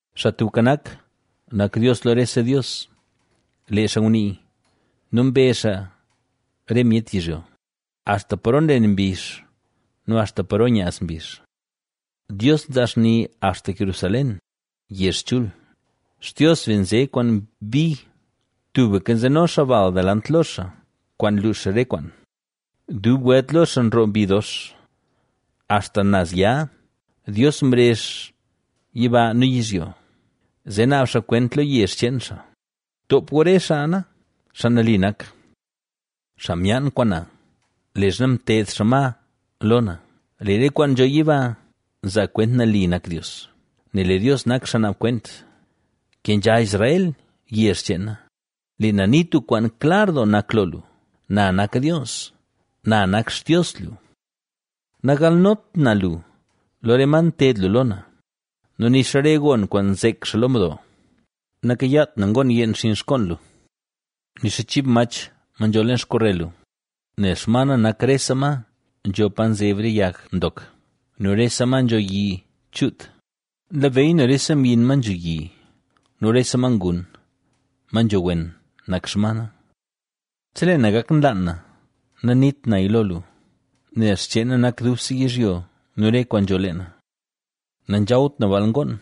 Xaa Tubka Nak, nak Dios lo rese dios, lee xaa ngunii nu mbezh xaa re myet yizhyo axta paro nlen mbizh nu axta paro nyaaz mbizh. Dios nzaa xni axta Jerusalén, yezh chul. Xtios be nze kwaan bi; tubka nzeno xaa bal delant lo xaa kwaan luux re kwaan, dub welt lo xaa nroo mbi dox. Axta naz ya, Dios mrezh yiba nu yizhyo, zee naab xaa kwent lo yezh cheen xaa: “Toop gu re xaa na, xaa nali nak xaa myaan kwaan na, leezha mted xaa ma lo na”. ¡Lee re kwaan nzho yiba nzaa kwent nali nak Dios, nel lee Dios nak xaa naab kwent! Kenzha Israel, yezh cheen na; lee na nii tub kwaan klar nak lo lu. Na nak Dios. Na nak Xtios lu. Nagalnot na lu, lo re ma nted lu lo na nu nixa re gon kwaan nzek xaa lo mdo. Nakayaat na ngoon yeen xinn xkoon lu, nixa chib mach ma nzho leen xkorel lu, nel xma na nak rese ma nzho pa nzeb re yag ndok nu rese ma nzho yi chuut. Nlabeyy na rese myin, ma nzho yi nu rese ma ngun, ma nzho wen nak xma na. Chelee na gak nlaan na nanit naya lo lu, nel xcheen na nak dubse yizhyo nu re kwaan nzho leena. Nanzhawt na baal ngoon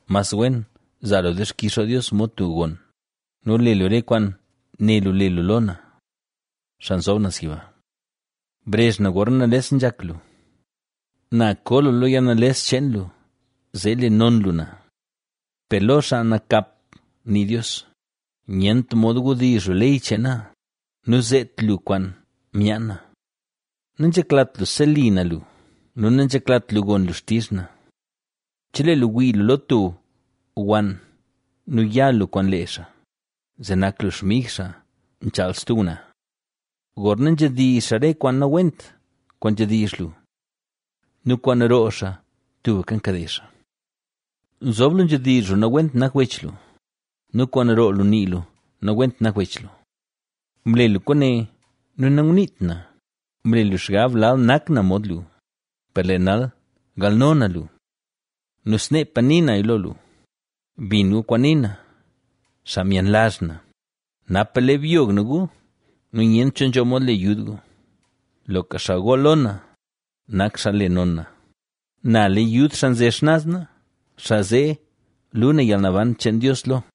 Mas wen zaa lu dixkix lo Dios mod tub gon nu le lu re kwaan né lu le lu lo na, Xaa Nzob Naz Yiba. Brezh na gorna nales nzhak lu; na ko lu lo yalnales cheen lu zee le non lu na. Per lo xaa nakap nii Dios: “Nyent mod wdizh lu ley cheen na nu zeet lu kwaan myaan na. Nanzheklat lu seli na lu nu nanzheklat lu gon lu xtizh na. Chelee lu wii lu lo tub wann nu ya lu kwaan lee xaa, zee nak lu xmig xaa nchaal stub ngwnaa. Gorna nzhedizh xaa re kwaan nawent kwaan nzhedizh lu nu kwaan roo xaa tubka nkade xaa. Nzob lu nzhedizh lu nawent nak wech lu nu kwaan roo lu nii lu nawent nak wech lu. Mle lu kwaane nu nanguniit na; mle lu xgab lal nak na mod lu, per lee nal galno na lu nu sneepa ni naya lo lu.” Bin gu kwaan nii na, xaa myenlazh na, napa le byog na gu nu nyent cho nzho mod le yud gu. Loka xaa gool lo na, nak xaa le non na; na le yud xaa nze xnaz na xaa zee lu na yalnaban cheen Dios lo.